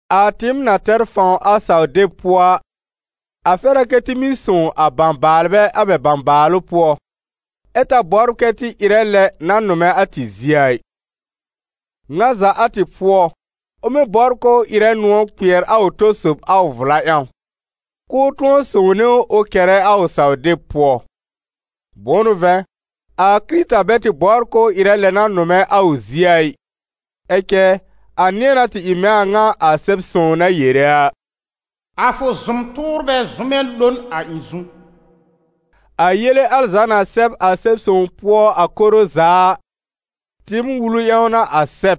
A tɩɩm na tɛr fãw a saw-deb pʋɔ a, a fɛr a kɛ tɩ mɩ́ sõw a bãbaalbɛ a bɛ bãbaalʋ pʋɔ, ɛ ta bɔbr kɛ tɩ ɩrɛ lɛ na nʋmɛ a tɩ zie a ɩ. Ŋa za a tɩ pʋɔ, ʋ mɩ́ bɔbr k'ʋʋ ɩrɛ nʋ̃ɔ̀ kpɩɛr a ʋ tɔ-sob a ʋ vla ƴãw, k'ʋʋ tʋ̃ɔ sõwne ʋ ʋ kɛrɛ a ʋ saw-deb pʋɔ. Bʋ̃ʋ n'ʋ vɛ̃, a Kɩrɩta bɛ tɩ bɔbr k'ʋʋ ɩrɛ lɛ na nʋmɛ a ʋ zie a ɩ, ɛ cɛ a nɩ̃ɛ na tɩ ɩ mɛ̃ a ŋa a Sɛb-sõw na yere a: «A fʋ zʋm-tʋʋrbɛ zʋmɛ lo n a ɩ̃ zu.» A yele al za na sɛb a Sɛb-sõw pʋɔ a koro za a, tɩɩm wulu ƴãw n'a a sɛb,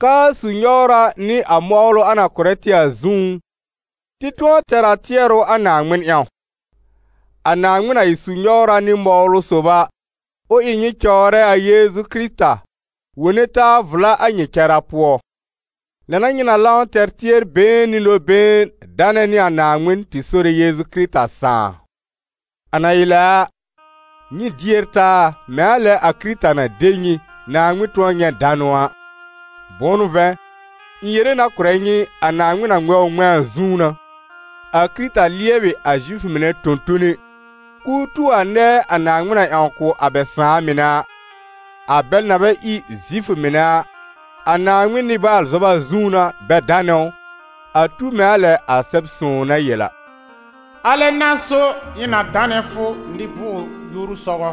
k'aa su-nyɔwra nɩ a mɔwlʋ a na kʋ̀rɛ tɩ a zũú, tɩ tʋ̃ɔ tɛr a tɩɛrʋ a Naaŋmɩn ƴãw. A Naaŋmɩn na ɩ su-nyɔwra nɩ mɔwlʋ sob a, ʋ ɩ nyɩ cɔwrɛ a Yeezu Kɩrɩta, wone taa vla a nyɩ cara pʋɔ. Lɛ n'a nyɩ na lãw tɛr tɩɛr-been nɩ nɔ-been danɛ nɩ a Naaŋmɩn, tɩ Sore Yeezu Kɩrɩta Sãà. A na ɩ lɛ a, nyɩ dier taa, mɛ̃ a lɛ a Kɩrɩta na de nyɩ, Naaŋmɩn tʋ̃ɔ nyɛ̃ danʋ a. Bʋ̃ʋ n'ʋ vɛ̃, ɩ̃ yere na kʋ̀rɛ nyɩ, a Naaŋmɩn na ŋmɛ̃ ʋ ŋmɛ̃a a zũú n'a, a Kɩrɩta lɩɛbɩ a Zifʋ mɩnɛ tõ-tone, k'ʋʋ tu a nɛɛ a Naaŋmɩn na ƴãw kʋ̀ a bɛ sãà mɩnɛ a. A bɛl na bɛ ɩ Zifʋ mɩnɛ a, a Naaŋmɩn nɩ-baal-zɔba zũú n'a bɛ danɛ ʋ, a tu mɛ̃ a lɛ a Sɛb-sõw na yel a: «Alɛ n'a so ɩ̃ na danɛ fʋ nɩ-bʋʋr-yoru sɔgɔ,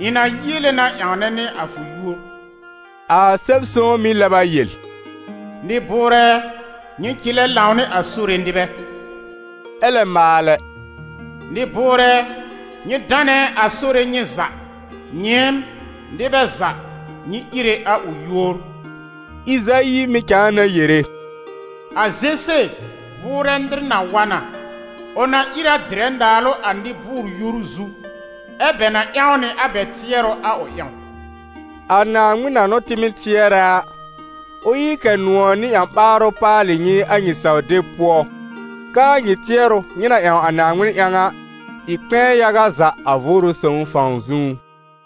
ɩ̃ na yiele na ƴãwnɛ nɩ a fʋ yúor.» A Sɛb-sõw mɩ̀ lɛb a yel: «Nɩ-bʋʋrɛ ɛ, nyɩ cɩlɛ lãw nɩ a Sore nɩbɛ!» Ɛ lɛ maalɛ: «Nɩ-bʋʋrɛ ɛ, nyɩ danɛ a Sore nyɩ za, nyɩɩm, nɩbɛ za, nyɩ íre a ʋ yúor!» Ɩzayi mɩ̀ cãa na yere: «A Zese bʋʋrɛ nɩr na wa na, ʋ na ìr a dɩrɛ naalʋ a nɩ-bʋʋr-yoru zu, ɛ́ bɛ na ƴãw nɩ a bɛ tɩɛrʋ a ʋ ƴãw.» A Naaŋmɩn na n'ʋ tɩ mɩ́ tɩɛrɛ a, ʋ ɩ kɛ nʋ̃ɔ̀ nɩ ƴã-ɓaarʋ paalɩ nyɩ a nyɩ saw-deb pʋɔ, k'aa nyɩ tɩɛrʋ, nyɩ na ƴãw a Naaŋmɩn ƴãw a, ɩ kpɛ̃ɛ yaga za a Vʋʋrʋ Sõw fãw zũú.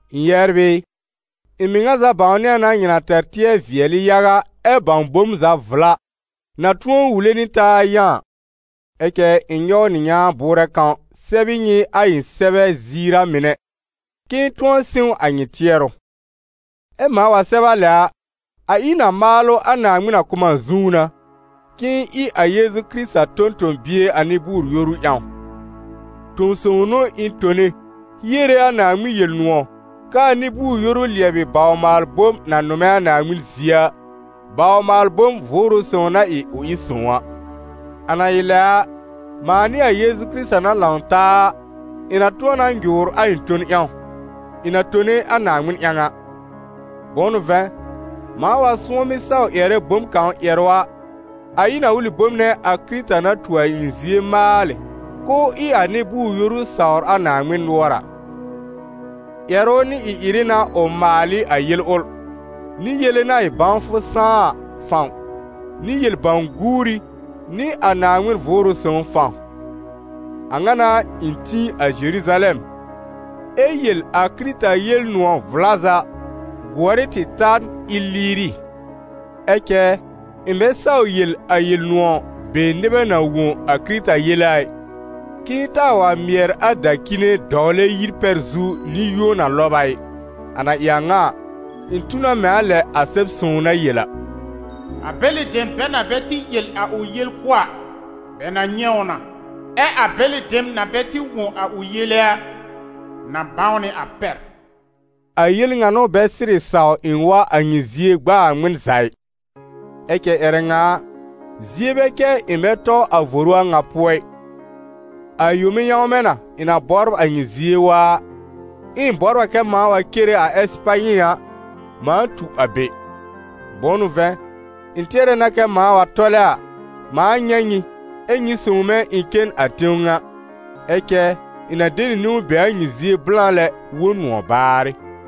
Ɩ̃ yɛbr ɩ, ɩ̃ mɩŋa za bãwnɩ a na nyɩ na tɛr tɩɛr-vɩɛlɩ yaga ɛ bãw bom za vla, na tʋ̃ɔ wule nɩ taa yã a. Ɛ cɛ ɩ̃ nyɔw nɩ nyãa bʋʋrɛ kãw sɛb ɩ nyɩ a ɩ̃ sɛbɛ ziir a mɩnɛ, k'ɩ̃ɩ tʋ̃ɔ sɩ̃w a nyɩ tɩɛrʋ. Ɛ mãa wa sɛb a lɛ a, a ɩ n a maalʋ a Naaŋmɩn na kʋ̀ m a zũú n'a, k'ɩ̃ɩ ɩ a Yeezu Kɩrɩta tõ-tõ-bie a nɩ-bʋʋr-yoru ƴãw. Tõ-sõw n'ʋ ɩ̃ tone hiere a Naaŋmɩn Yel-nʋ̃ɔ̀, k'aa nɩ-bʋʋr-yoru lɩɛbɩ baw-maal-bom na nʋmɛ a Naaŋmɩn zie a, baw-maal-bom Vʋʋrʋ Sõw na ɩ k'ʋ ɩ sõw a. A na ɩ lɛ a, mãa nɩ a Yeezu Kɩrɩta na lãw taa a, ɩ̃ na tʋ̃ɔ na nyʋʋr a ɩ̃ ton ƴãw, ɩ̃ na tone a Naaŋmɩn ƴãw a. Bʋ̃ʋ n'ʋ vɛ̃, mãa wa sʋ̃ɔmɩ saw ƴɛrɛ bom kãw ƴɛrʋ a, a ɩ n a ʋlɩ bom nɛ a Kɩrɩta na tu a ɩ̃ zie maalɩ, k'ʋʋ ɩ a nɩ-bʋʋr-yoru sawr a Naaŋmɩn nʋɔr a. Ƴɛrʋ nɩ ɩ-ɩrɩ n'a ʋ maal ɩ a yel ʋl, nɩ yele na ɩ bãwfʋ sãá a fãw, nɩ yel bãw-guuri nɩ a Naaŋmɩn Vʋʋrʋ Sõw fãw. A ŋa n'a, ɩ̃ tĩ a Zeruzalɛm ɛ yel a Kɩrɩta Yel-nʋ̃ɔ̀ vla za gʋɔr ɩ tɩ ta n Ɩlɩɩrɩ. Ɛ cɛ ɩ̃ bɛ saw yel a Yel-nʋ̃ɔ̀ be nɩbɛ na wõ a Kɩrɩta yele a ɩ, k'ɩ̃ɩ taa wa mɩɛr a dacine dɔwlɛ yir pɛr zu nɩ-yũo na lɔb a ɩ. A na ɩ ŋa a, ɩ̃ tu na mɛ̃ a lɛ a Sɛb-sõw na yel a: «A bɛlɩ dem bɛ na bɛ tɩ yel a ʋ yel kʋ̀ a, bɛ na nyɛ̃ ʋ na, ɛ a bɛlɩ dem na bɛ tɩ wõ a ʋ yele a, na bãw nɩ a pɛr.» A yel ŋa n'ʋ bɛ sɩrɩ saw ɩ̃ wa a nyɩ zie gb'aa ŋmɩn za ɩ. Ɛ cɛ ƴɛrɛ ŋa a, zie bɛ cɛ ɩ̃ bɛ tɔ a voru a ŋa pʋɔ ɩ. A yome yãwmɛ na ɩ̃ na bɔbr a nyɩ zie waa a, ɛ ɩ̃ bɔbr a kɛ mãa wa cere a Ɛsɩpanyɩ a, mãa tu a be. Bʋ̃ʋ n'ʋ vɛ̃, ɩ̃ tɩɛrɛ na kɛ mãa wa tɔlɛ a, mãa nyɛ̃ nyɩ, ɛ́ nyɩ sõw mɛ̃ ɩ̃ cen a tẽw ŋa; ɛ cɛ ɩ̃ na de nɩ niwn be a nyɩ zie blã lɛ wõ nʋ̃ɔ̀ baarɩ.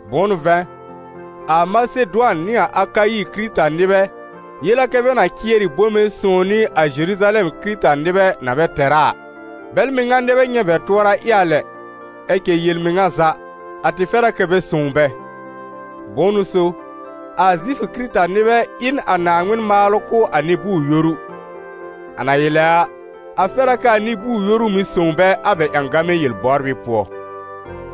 Bʋ̃ʋ n'ʋ vɛ̃, a Masedʋan nɩ a Akayi Kɩrɩta-nɩbɛ yel a kɛ bɛ na cɩɛr ɩ bome sõw nɩ a Zeruzalɛm Kɩrɩta-nɩbɛ na bɛ tɛr a a. Bɛl mɩŋa nɛ bɛ nyɛ̃ bɛ tʋɔra ɩ a lɛ, ɛ cɛ yel-mɩŋa za, a tɩ fɛr a kɛ bɛ sõw bɛ. Bʋ̃ʋ n'ʋ so, a Zifʋ Kɩrɩta-nɩbɛ ɩ n a Naaŋmɩn maalʋ kʋ̀ a nɩ-bʋʋr-yoru; a na ɩ lɛ a, a fɛr a k'aa nɩ-bʋʋr-yoru mɩ̀ sõw bɛ a bɛ ƴãgamɛ yel-bɔbrɩ pʋɔ.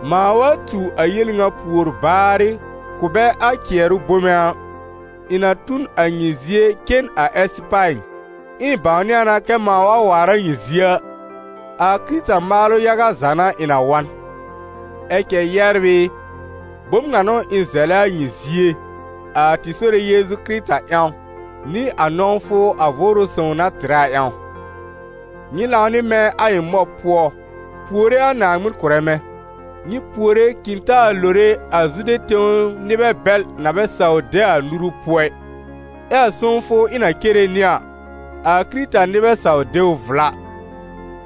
Mãa wa tu a yel ŋa pùor baarɩ, kʋ̀ bɛ a cɩɛrʋ bome a, ɩ̃ na tu n a nyɩ zie cen a Ɛsɩpanyɩ. Ɛ ɩ̃ bãwnɩ a na kɛ mãa wa waar a nyɩ zie a, a Kɩrɩta maalʋ yaga za n'a ɩ̃ na wa n. Ɛ cɛ yɛbr ɩ, bom ŋa n'ʋ ɩ̃ zɛlɛ a nyɩ zie, a tɩ Sore Yeezu Kɩrɩta ƴãw, nɩ a nɔ̃wfʋ a Vʋʋrʋ Sõw na tɩrɛ a ƴãw: nyɩ lãw nɩ mɛ̃ a ɩ̃ mɔb pʋɔ, puore a Naaŋmɩn kʋ̀rɛ mɛ̃. Nyɩ puore k'ɩ̃ taa lore a Zude tẽw nɩbɛ bɛl na bɛ saw de a nuru pʋɔ ɩ, ɛ a sõwfʋ ɩ̃ na cere nɩ a, a Kɩrɩta-nɩbɛ saw de ʋ vla.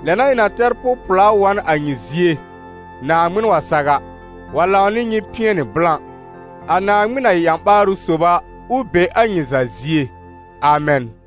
Lɛ n'a ɩ̃ na tɛr pʋ-pɩɛlʋ wa n a nyɩ zie, Naaŋmɩn wa saw a, wa lãw nɩ nyɩ pɩɛnɩ blã. A Naaŋmɩn na ɩ a ƴã-ɓaarʋ sob a, ʋ be a nyɩ za zie. Amɛn.